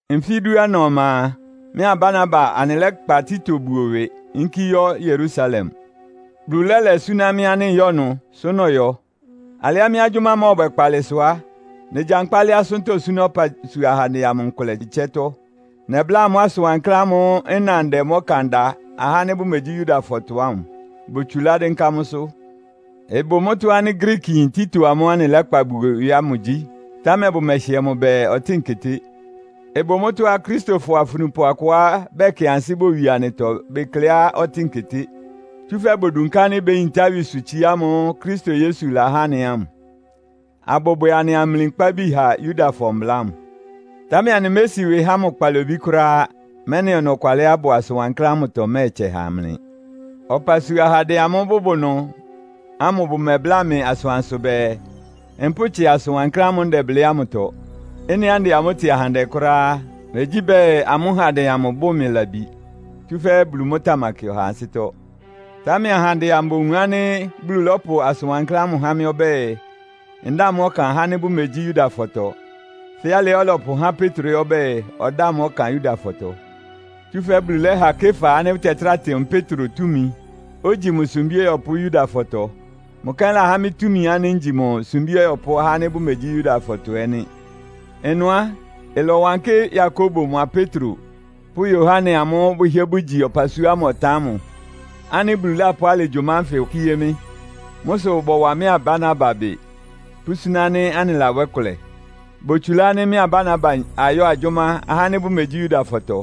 Nfí dúana ɔma a, mɩ́a Barnaba anɩlɛ́kpa Tito buo ɩwɩ, yínkí yɔ́ Yerusalem. Bulu lɛ́lɛ súná mɩ́ ánɩ́ nyɔ́ ɩnʋ, sʋ́ nɔyɔ. Alɩá mɩ́ agyʋ́má mɔ́ɔbwɛ kpaalɩ sʋ á, negyankpá lɛ́ asʋ́ntɔ́ súná ɔpasua ahandɛ amʋ nkʋlɛ ɩtsɛ́tɔ́. Nɛbláa amʋ́ asʋn wankláán ámʋ́ʋ́ nna ndɛ mʋ́ ɔkan da ahá ánɩ́ bʋmegyí Yudafɔtɔ ámʋ. Botsulá dɩ́nká mʋ́sʋ́. Ɩbʋ mʋ́tɔ́ ánɩ́ Griikiyin Tito amʋ́ʋ́ anɩlɛ́kpa buo ɩwɩ ámʋ gyí, támɛ bʋmɛhɩɛ mʋ bɛɛ, ɔtɩ́ɩn keté. Ɩbʋ mʋ́tɔ́á Akristofɔ afunupʋ akʋá bɛkɩ ansɩ́ bowie anɩtɔ bekleá ɔtɩ́ɩn keté. Tsúfɛ́ bodunká ánɩ́ béyintá ɩwɩsʋtsiá amʋ́ʋ́ Kristo Yesu lahá anɩ ámʋ; abʋbwɛ anɩ amli nkpábi ha Yudafɔ mbla ámʋ. Támɛ anɩmési ɩwɩ há amʋ́ kpalobí kʋ́ráá, mɛ́nɩ ɔnɔkwalɩá ɩbʋ asʋn wankláán ámʋtɔ ɩmɛ́ɛtsɛ ha mlɩ. Ɔpasua ahandɛ amʋ́ʋ́ bʋbʋ ɩnʋ ámʋ bʋmɛbláa mɩ asʋansʋ bɛɛ, mpʋ́tsɩa asʋ́n wankláán ámʋ́ʋ́ ndɛblɩ́ ámʋtɔ. (Ɩ́nɩá ndɛ amʋ́ tɩ ahandɛ kʋ́ráá á, megyí bɛɛ, amʋ́ handɛ amʋ ɩbʋ mɩ labi, tsúfɛ́ Bulu mʋ́ tamakɩ ɔhaa ansɩ́tɔ́.) Támɛ ahandɛ amʋ bowun ánɩ́ Bulu lɔ́pʋ asʋn wankláán ámʋ há mɩ́ ɔbɛ́ɛ, ndáa mʋ́ ɔkan ahá ánɩ́ bʋmegyí Yudafɔtɔ, fɛ́ alɩá ɔlɔpʋhá Petro ɛ́ ɔbɛ́ɛ, ɔdáa mʋ́ ɔkan Yudafɔtɔ. Tsúfɛ́ Bulu lɛ́ha Kefa ánɩ́ bʋtɛtráa tɩ mʋ Petro túmi, ogyi mʋ sumbí ɔyɔpʋ́ Yudafɔtɔ. Mʋ kɛ́n láhá mɩ́ túmi, ngyi mʋ sumbí ɔyɔpʋ́ ahá ánɩ́ bʋmegyí Yudafɔtɔ ɛ́ nɩ́. Ɩnʋ á, ɩlɔwankɩ́ Yakobo mʋa Petro pʋ́ Yohane amʋ́ʋ́ bʋhɩ́ɛ́ bʋgyi ɔpasua ámʋ ɔtan ámʋ ánɩ́ Bulu lápʋ́ alɩ agyʋ́má ánfɩ kíé mɩ́. Mʋ́ sʋ bɔwa mɩ́a Barnaba ɩbɩ, pʋ́súná ánɩ́ anɩlabwɛ́ kʋlɛ. Botsulá ánɩ́ mɩ́a Barnaba ayɔ́ agyʋ́má ahá ánɩ́ bʋmegyí Yudafɔtɔ,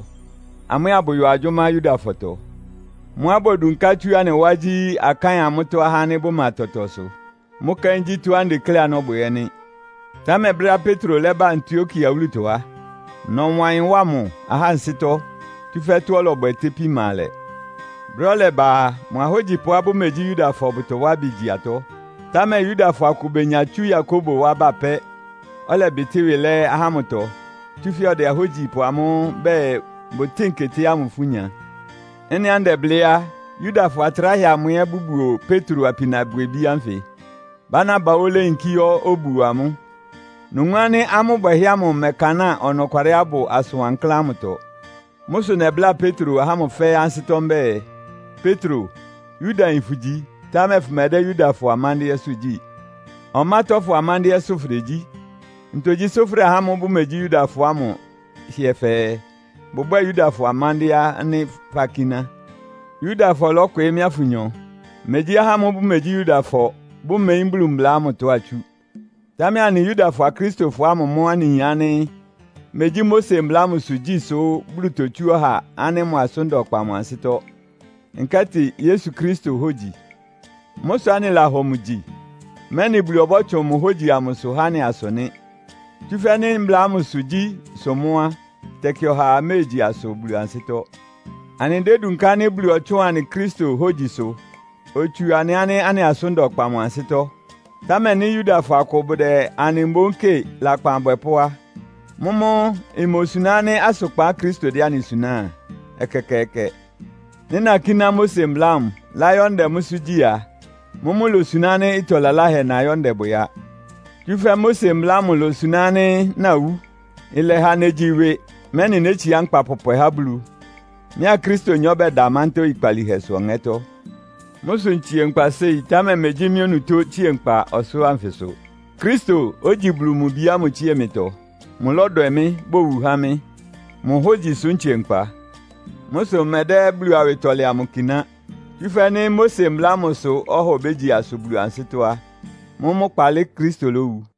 amʋ́ ɛ́ abʋyɔ agyʋ́má Yudafɔtɔ. Mʋ́á bodunká tsú anɩ wá gyí, akáɩn amʋ́tɔ́ ahá ánɩ́ bʋma tɔtɔsʋ. Mʋ́ kɛ́n gyí tɔ́á ndekléá nɔ́bwɛ ɛ́ nɩ́. Támɛ brɛ́á Petro lɛ́ba Antiokia wúlutɔ á, nɔwa ɩyɩn wá mʋ ahá ansɩ́tɔ́, tsúfɛ́ tɔ́á ɔlɔbwɛ itépí ma alɛ. Brɛ́á ɔlɛba a, mʋa ahógyipʋá bʋmegyí Yudafɔ bʋtɔwá ɩbɩ gyi atɔ́, támɛ Yudafɔ akʋ benya tsú Yakobo wá ba pɛ́, ɔlɛbɩtɩ́ ɩwɩ lɛ́ ahá ámʋtɔ, tsúfɛ́ ɔdɛ ahógyipʋ amʋ́ʋ́ bɛɛ bʋtɩ́n keté ámʋ ifú nya. Ɩ́nɩá ndɛblɩ́ á, Yudafɔ atráhɛ amʋ ɛ́ bʋbuo Petro apinabwɛbí ánfɩ. Barnaba óó léyinkí yɔ́ obuo amʋ́. Nowun ánɩ́ amʋ́ bwɛhɛ́ ámʋ ɩmɛkanáa ɔnɔkwalɩá ɩbʋ asʋn wankláán ámʋtɔ. Mʋ́ sʋ nɛbláa Petro ahá ámʋ fɛ́ɛ́ ansɩ́tɔ́ mbɛ́ɛ, “Petro, Yudayin fʋgyi, támɛ fʋmɛdɛ́ Yudafɔ amándɩ́ɛ́sʋ́ gyí. Ɔmátɔ́fɔ amándɩ́ɛ́sʋ́ fʋdegyí. Ntogyi sʋ́ fʋdɛ ahá ámʋ́ʋ́ bʋmegyí Yudafɔ ámʋ hɩɛ fɛɛ, bʋbwɛ́ɛ Yudafɔ amándɩ́ɛ́ ánɩ́ fakíná?” Yudafɔ lɔ́kwɩɩ́ mɩ́a fʋnyɔ. Megyí ahá ámʋ́ʋ́ bʋmegyí Yudafɔ, bʋmeyín Bulu mbla ámʋtɔ atsú. Támɛ anɩ Yudafɔ Akristofɔ ámʋ mʋ́ anɩyin ánɩ́ megyí Mose mbla ámʋsʋ gyí sʋ Bulu totsú ɔha ánɩ́ mʋ asʋ́n da ɔkpa mʋ ansɩ́tɔ́, nkɛ́tɩ Yesu Kristo hógyi. Mʋ́ sʋ anɩlahɔ mʋ gyi, mɛ́nɩ Bulu ɔbɔ́tsʋn mʋ hógyi amʋsʋ há anɩ asʋ nɩ́. Tsúfɛ́ nɩ́ mbla ámʋsʋ gyí sʋ mʋ́ á, tɛkɩ ɔhaa méegyi asʋ Bulu ansɩ́tɔ́. Anɩdédunká ánɩ́ Bulu ɔtsʋ́ʋn anɩ Kristo hógyisʋ, otsu anɩ ánɩ́ anɩ asʋ́n da ɔkpa mʋ ansɩ́tɔ́. Támɛ nɩ́ Yudafɔ akʋ bʋdɛ anɩ mboún kɩ́ɩ lakpan abwɛpʋ́ á, mʋ́mʋ́ imosuná ánɩ́ asʋkpan Kristo dɛ́ anɩ suná a? Ɛkɛkɛɛkɛ! Nɩ́ nakíná Mose mbla ámʋ, láyɔ́ ndɛ mʋ́sʋ́ gyí a, mʋ́mʋ́ ilosuná ánɩ́ ɩtɔ laláhɛ nɔyɔ ndɛbwɛ á. Tsúfɛ́ Mose mbla ámʋ ilosuná ánɩ́ nawú. Ɩlɛha negyi ɩwɩ, mɛ́nɩ nétsiá nkpa pɔpwɛ há Bulu. Mɩ́a Kristonyɔ bɛda mántá oyikpalíhɛsʋ ɔŋɛ́tɔ́. Mʋ́ sʋ ntsie nkpa séi, támɛ megyí mɩ́ onutó tsíe nkpa ɔsʋlʋ́ʋ anfɩsʋ. Kristo, ogyi Bulu mʋ Bi ámʋ tsíe mɩtɔ. Mʋlɔ́dwɛ mɩ́, bowu há mɩ́. Mʋ hógyi sʋ́ ntsie nkpa. Mʋ́ sʋ mmɛdɛ́ Bulu awɩtɔlɛ amʋ kiná. Tsúfɛ́ nɩ́ Mose mbla ámʋ sʋ́ ɔha obégyi asʋ Bulu ansɩ́tɔ́ á, mʋ́mʋ́ kpaalɩ Kristo lówu!